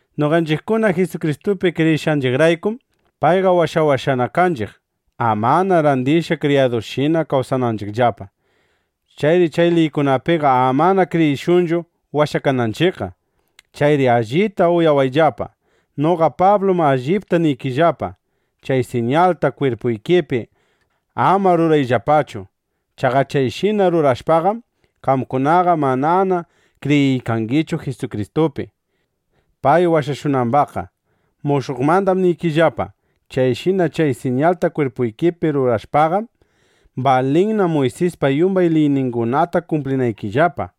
Noqanchiqkuna Jisukristupi kriyishqanchiqraykum, payqa washawashqana kanchiq, amana randishqa kriyadushina kawsananchiqllapa. Chayri chay liykunapiqa amana kriyishunchu washakananchiqqa. Chayri allita uyawayllapa, noqa Pablum allipta niykillapa: Chay siñalta kwirpuykipi ama rurayllapachu. Chaqa chayshina rurashpaqam, qamkunaqa manana kriyiykangichu Jisukristupi, pay washashunambaqqa. Mushuqmandam niriykillapa: Chayshina chay siñalta kwirpuykipi rurashpaqam, balinna Muysispa yumbay liyningunata kumplinaykillapa.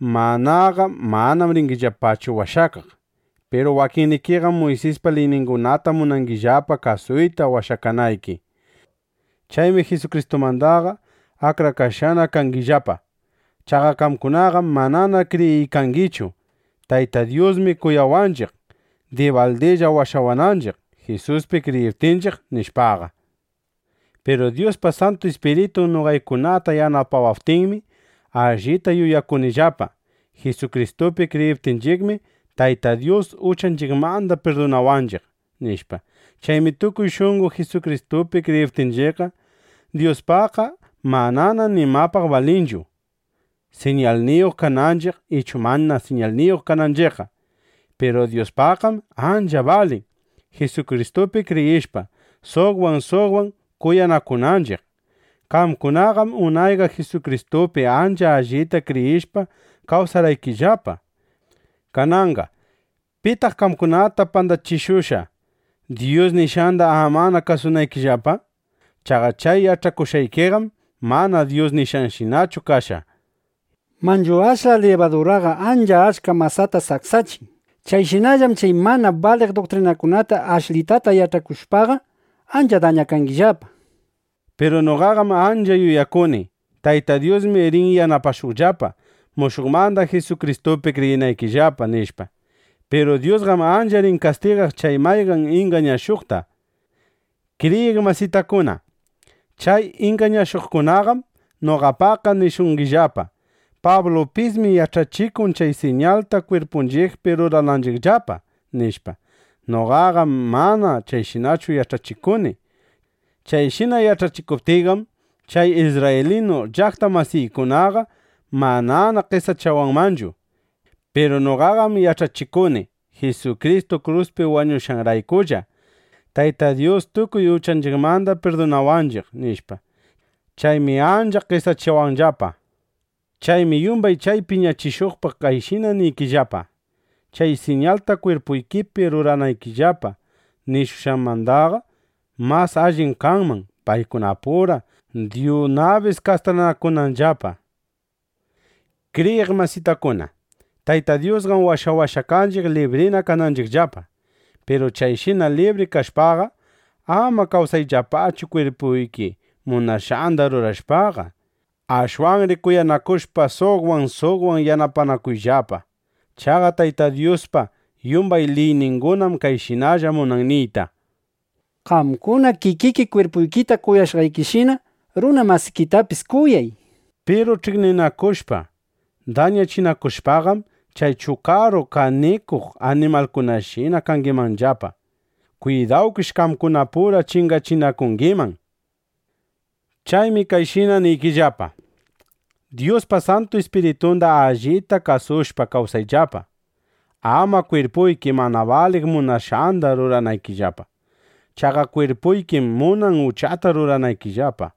(Manaqa manam ringillapachu washakaq.) Piru wakinnikiqam Muysispa liyningunata munangillapa kasuyta washakanayki. Chaymi Jisukristumandaqa akrakashqana kangillapa. Chaqa qamkunaqam manana kriyiykangichu: Tayta Dyusmi kuyawaqninchiq dibaldilla washawanchiq, Jisuspi kriyiptinchiq, nishpaqa. Piru Dyuspa Santu Ispiritun noqaykunata yanapawaptinmi, allita yuyakunillapa: Jisukristupi kriyiptinchiqmi, Tayta Dyus uchanchiqmanda pirdunawanchiq, nishpa. Chaymi tukuy shunqo Jisukristupi kriyiptinchiqqa, Dyuspaqqa manana nimapaq balinchu, siñalniyuq kananchiq ichu mana siñalniyuq kananchiqqa. Piru Dyuspaqqam ancha balin, Jisukristupi kriyishpa, suqwan suqwan kuyanakunanchiq. Qamkunaqam unayqa Jisukristupi ancha allita kriyishpa kawsarqaykillapa. Kananqa ¿pitaq qamkunata pandachishushqa, Dyus nishqanda amana kasunaykillapa? Chaqa chay yach'akushqaykiqam mana Dyus nishqanshinachu kashqa. Manchu ashla libaduraqa ancha achka masata saksachin. (Chayshinallam chay mana baliq duktrinakunata ashlitata yach'akushpaqa, ancha dañakangillapa.) Piru noqaqam ancha yuyakuni: Tayta Dyusmi rin yanapashuqllapa, mushuqmanda Jisukristupi kriyinaykillapa, nishpa. Piru Dyusqam ancha rin kastigaq chay mayqan ingañashuqtaqa. Kriyiq masitakuna, chay ingañashuqkunaqam noqapaqqa nishungillapa: “Pablupismi yach'achikun, chay siñalta kwirpunchiqpi rurananchiqllapa”, nishpa. Noqaqam mana chayshinachu yach'achikuni. Chayshina yach'achikuptiyqam, chay isrraylinu llaqta masiykunaqa manana qesachawanmanchu. Piru noqaqam yach'achikuni: “Jisukristu kruspi wañushqanraykulla, Tayta Dyus tukuy uchanchiqmanda pirdunawanchiq”, nishpa. Chaymi ancha qesachawanllapa. Chaymi yumbay chay piñachishuqpaq kayshina niykillapa: ¡Chay siñalta kwirpuykipi ruranaykillapa nishunanmandaqa, mas allim kanman paykunapura dyunabis kastranakunanllapa! Kriyiq masitakuna, Tayta Dyusqam washawashqa kanchiq, librina kananchiqllapa. Piru chayshina libri kashpaqa, ama kawsayllapachu kwirpuyki munashqanda rurashpaqa. Ashwanri kuyanakushpa suqwan suqwan yanapanakuyllapa. Chaqa Tayta Dyuspa yumbay liyningunam kayshinalla munan niyta: “Qamkuna kikiki kwirpuykita kuyashqaykishina, runa masikitapis kuyay”, nishpa. Piru ch'iqninakushpa dañachinakushpaqam, chay chukaru kaninakuq animalkunashina kangimanllapa. Kwidawkish, qamkunapura chingachinakungiman. Chaymi kayshina niykillapa: Dyuspa Santu Ispiritunda allita kasushpa kawsayllapa, ama kwirpuyki mana baliq munashqanda ruranaykillapa. Chaqa kwirpuykim munan uchata ruranaykillapa.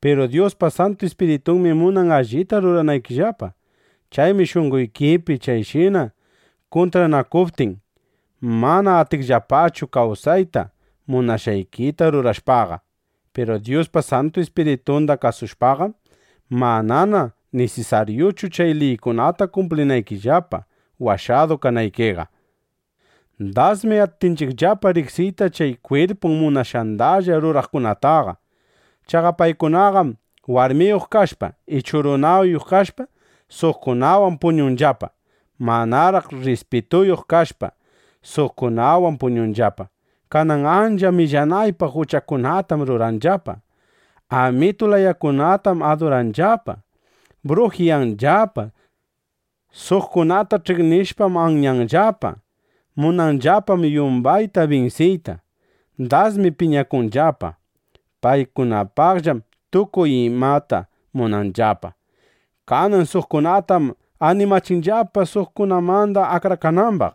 Piru Dyuspa Santu Ispiritunmi munan allita ruranaykillapa. Chaymi shunqoykipi chayshina kuntranakuptin, mana atingillapachu kawsayta munashqaykita rurashpaqa. Piru Dyuspa Santu Ispiritunda kasushpaqam, manana nisisaryuchu chay liykunata kumplinaykillapa, washadu kanaykiqa. Dasmi atinchiqllapa riqsiyta chay kwirpun munashqandalla ruraqkunataqa. Chaqa paykunaqam warmiyuq kashpa ichu runayuq kashpa, suqkunawan puñunllapa. Manaraq rrispituyuq kashpa, suqkunawan puñunllapa. Kanan ancha millanaypaq uchakunatam ruranllapa. Amitu layakunatam aduranllapa. Brujiyanllapa. Suqkunata ch'iqnishpam anyanllapa. Munanllapam yumbayta binsiyta. Dasmi piñakunllapa. Paykunapaqllam tukuy imata munanllapa. Kanan suqkunatam animachinllapa suqkunamanda akrakanambaq.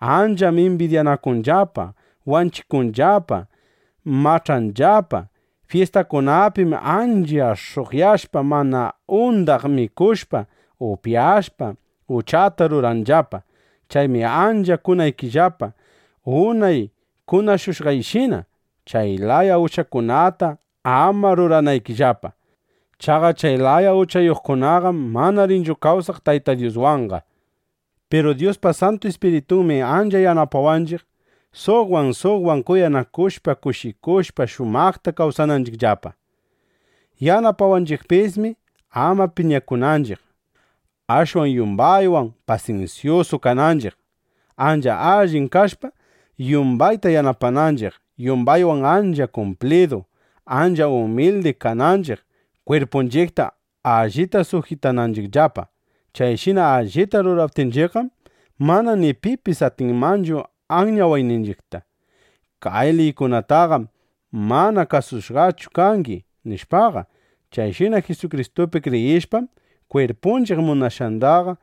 Ancham imbidyakunllapa, wanchikunllapa; mach'anllapa. Fyistakunapim ancha sh'uqyashpa, mana undaq mikushpa, upyashpa, uchata ruranllapa. Chaymi ancha kunaykillapa unay kunashushqayshina, chay laya uchakunata ama ruranaykillapa. Chaqa chay laya uchayuqkunaqam mana rinchu kawsaq Tayta Dyuswanqa. Piru Dyuspa Santu Ispiritunmi ancha yanapawanchiq, suqwan suqwan kuyanakushpa, kushikushpa, shumaqta kawsananchiqllapa. Yanapawanchiqpismi, ama piñakunanchiq; ashwan yumbaywan pasinsyusu kananchiq, ancha allin kashpa, yumbayta yanapananchiq, yumbaywan ancha kumplidu, ancha umildi kananchiq, kwirpunchiqta allita sujitananchiqllapa. Chayshina allita ruraptinchiqqam, mana ni pipis atinmanchu anyawayninchiqta: “Kay liykunataqam mana kasushqachu kangi”, nishpaqa. Chayshina Jisukristupi kriyishpaqam, kwirpunchiq munashqandaqa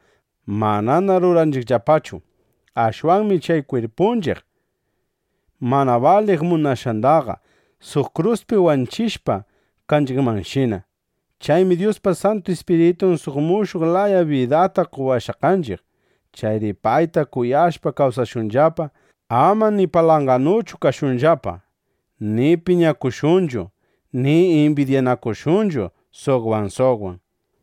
manana ruranchiqllapachu. Ashwanmi chay kwirpunchiq mana baliq munashqandaqa suq kruspi wanchishqa kanchiqmanshina. Chaymi Dyuspa Santu Ispiritun suq mushuq laya bidata qowashqa kanchiq. Chayri payta kasushpa kawsashunllapa. Ama ni palanganuchu kashunllapa, ni piñakushunchu, ni imbidyanakushunchu suqwan suqwan.